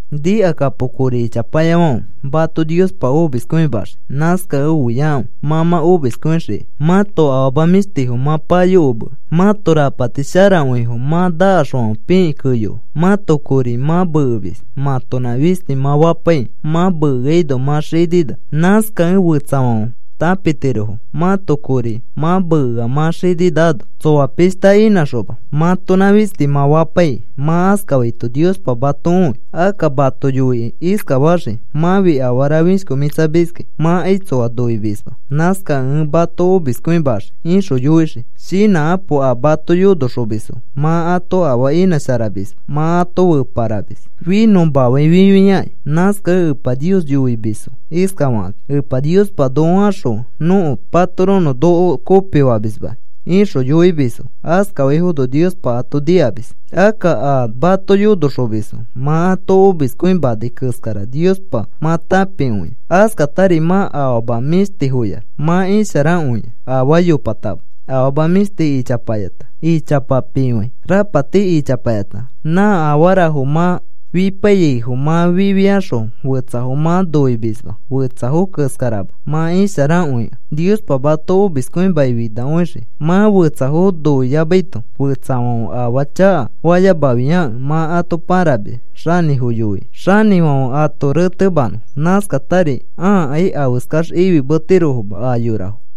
Nikakapo kori ichapayafãfe, mato Niospa omiskõimaxii. Nãskakẽ oiakãfe mã mã omiskõixikai. Mãto afama mĩshtifo mã payokomea. Mãto rapati sharakõifo mã nakaxfãfe pikĩ keyoa. Mãto kori mã mekemis mãtonã fisti mã fapaikĩ. Mã mekeaino mã xinina. Nãskakẽ fetsafãfe tãpitirofo mãto kori mã mekea mã xininaano, tsoa pishta inãxoma, mãtonã fisti mã fapaikĩ. Mã askafaito Niospa mato õi. Akka mato yoikĩ iskafaxii: “Mãfi afara fishkomĩtsamiskĩ. Mãkai tsoa noimisma. Nãskakẽ ẽ mato omiskõimaxii,” ixõ yoixii. Shinãkapo. A mato yonoxomisfo mã ato afaa inãsharamisma, mã ato feparamis finõmafãi fifiakĩ. Nãskakẽ Epa Nios yoimisfo iskafakakĩ: “Epa Niospa, noko axõfe nõko patoronõ noko kopifamismakĩ,” ixõ yoimisfo. Askafaifono Niospa ato nikamis. Akka a mato yonoxomisfo mã ato omiskõimanai keskara Niospa mã tãpikõia. Askatari mã afama mĩshtifoyax mã isharakõia, afaa yopatama. Afama mĩshti ichapayata, ichapa pifãi, rapati ichapayata, nã afarafo mã fipaiyaifo mã fifiaxõ fetsafo mã noimisma. Fetsafo keskarama mã isharakõikẽ, Niospa mato omiskõimakĩ finakõixii mã fetsafo noiyamaito. Fetsafãfe afaa chakafayamafiakẽ mã ato pãramis xanĩfo yoikĩ, xanĩfãfe ato retemanõ. Nãskatari ãakai afeskax ifimetirofoma a yorafo.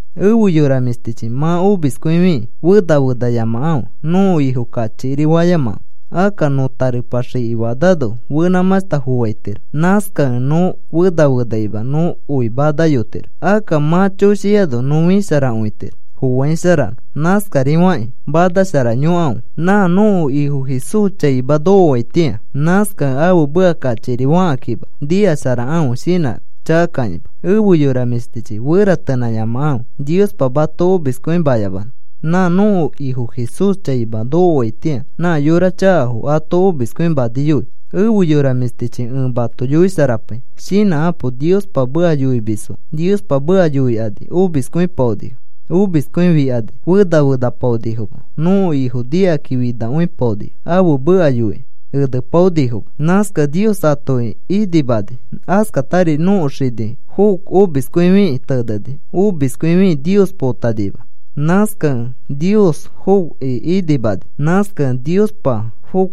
Efe yora mĩshtichi, mã omiskõifi fena fenayamakãfe. Nõko Ifo kachikiri fayamakãfe. Akka nõ tarepa xiki fanano fenãmãshta foaitiro. Nãskakẽ nõ fena fenakima. Nõ oi manayotiro. Akka mã choshiano nõ fisharakõitiro foaisharano. Nãskarifakĩ manasharayokãfe nã nõko Ifo Jesús chaima nokoaitĩa. Nãskakẽ ãfe meka kachikiri fakãkima, nikasharakãfe shinãchakakãkima. Efe yora mĩshtichi, feratenãyamakãfe Niospa mato omiskõimayamanõ. Nã nõko Ifo Jesús chaima nokoaitĩa nã yora chakafo ato omiskõimaniyoi. Efe yora mĩshtichi, ẽ mato yoisharapai, shinãkapo. Niospa meka yoimisfo Niospa meka yoikani omiskõipaonifo. Omiskõifikani fena fenapaonifoma. Nõko Ifo nikaki finakõipaonifo. Ãfe meka yoikĩ enepaonifoma. Nãskakẽ Nios atoki inimani. Askatari nõko xini Job omiskõifikĩ teneni. Omiskõifikĩ Nios potanima. Nãskakẽ Nios Jobki inimani. Nãskakẽ Niospa Job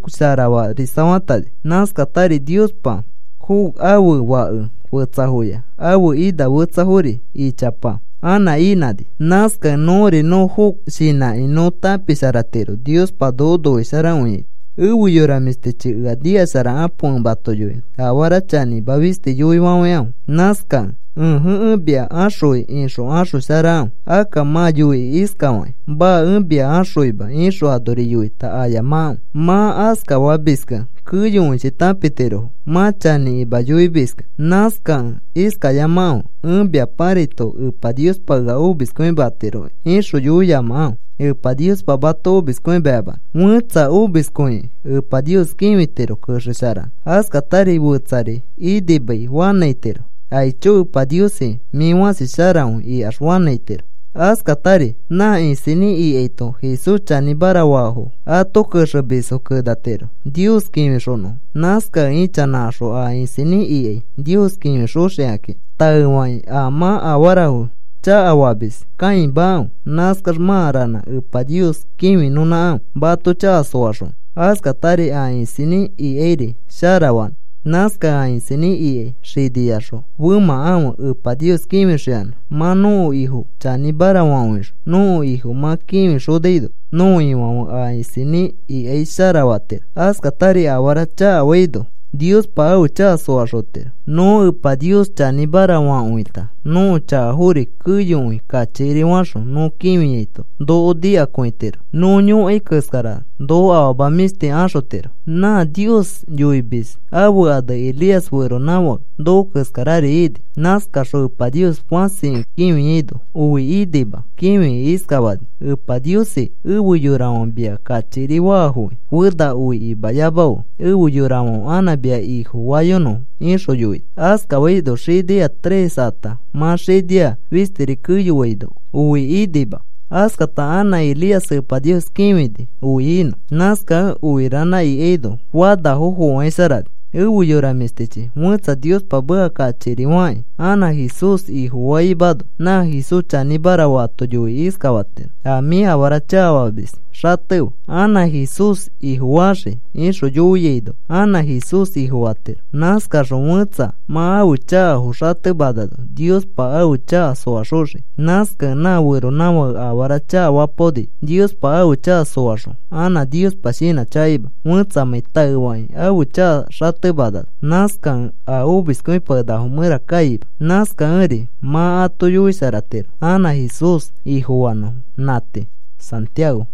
sharafarisafatani. Nãskatari Niospa Job ãfe fake fetsafoya ãfe ina fetsafori ichapa anã inãni. Nãskakẽ nõri nõ Job shinãkĩ nõ tãpisharatiro Niospa noko noisharakõiaito. Efe yora mĩshtichi, ea nikasharakapo ẽ mato yoinõ. Afara chanĩma fisti yoifafãikãfe. Nãskakẽ, “Ẽje, ẽ mia axõi,” ixõ axosharakãfe. Akka mã yoikĩ iskafakĩ: “Maa. Ẽ mia axõima,” ixõ anori yoita ayamakãfe. Mã askafamiskẽ keyokõichi tãpitirofo mã chanĩkima yoimiskẽ. Nãskakẽ iskayamakãfe: “Ẽ mia pãraito, Epa Niospa ea omiskõimatiroki,” ixõ yoiyamakãfe Epa Niospa mato omiskõimayamanõ. Fetsa omiskõikĩ Epa Nios kĩfitiro kexesharanõ. Askatari fetsari inimai fanãitiro. “Aicho Epa Niosi, mĩ fãsi sharakõi,” ikax fanãitiro. Askatari nã isinĩ ikaito Jesús chanĩmara faafo ãto kexemisfo kenatiro Nios kĩfixonõfo. Nãskakẽ ichanãkaxõ a isinĩ ikai Nios kĩfixoxikakĩ. Taefakĩ a mã afarafo chakafamis kãimakãfe. Nãskax mã ranã Epa Nios kĩfinõnãkãfe mato chaka soaxonõ, askatari a isinĩ ikairi sharafanõ. Nãskakẽ a isinĩ ikai xiniyaxõ femãkãfe, Epa Nios kĩfixoyanã. Mã nõko Ifo chanĩmara fakõixõ nõko Ifo mã kĩfixonaino, nõko Ifãfe a isinĩ ikai sharafatiro. Askatari afara chakafaino Niospa ãfe chaka soaxotiro. Nõ Epa Nios chanĩmara fakõita nõko chakafori keyokõi kachikiri faxõ nõ kĩfiaito noko nikakõitiro. Nõ yõkai keskara noko afama mĩshti axotiro. Nã Nios yoimis ãfe ane Elías feronãfake noko keskarari ini. Nãskaxõ Epa Nios fãsikõi kĩfiaino oi inima. Kĩfikĩ iskafani: “Epa Niosi, efe yorafãfe mia kachikiri faafokĩ, fena oi imayamafe, efe yorafãfe anã mia Ifofayonõfo,” ixõ yoini. Askafaino xinia tres ata mã xinia fistiri keyoaino oi inima. Askata anã Elías Epa Nios kĩfini oi inõ. Nãskakẽ oi ranã ikaino fanafo foaisharani. Efe yora mĩshtichi, fẽtsa Niospa meka kachikiri fakĩ anã Jesús Ifofaimano, nã Jesús chanĩmara faato yoikĩ iskafatiro: “A mĩ afara chakafamis xatefe, anã Jesús Ifofaxii,” ixõ yoiaino anã Jesús Ifofatiro. Nãskaxõ fẽtsa mã ãfe chakafo xatemanano, Niospa ãfe chaka soaxoxii. Nãskakẽ nã feronãfãke afara chakafapaoni Niospa ãfe chaka soaxõ, anã Niospa shinãchakaima fẽtsamãi taefakĩ ãfe chaka xatemanano. Nãskakẽ a omiskõipakenakafo mẽra kaima. Nãskakẽri mã ato yoisharatiro anã Jesús Ifofanõfo. Nã tii. Santiago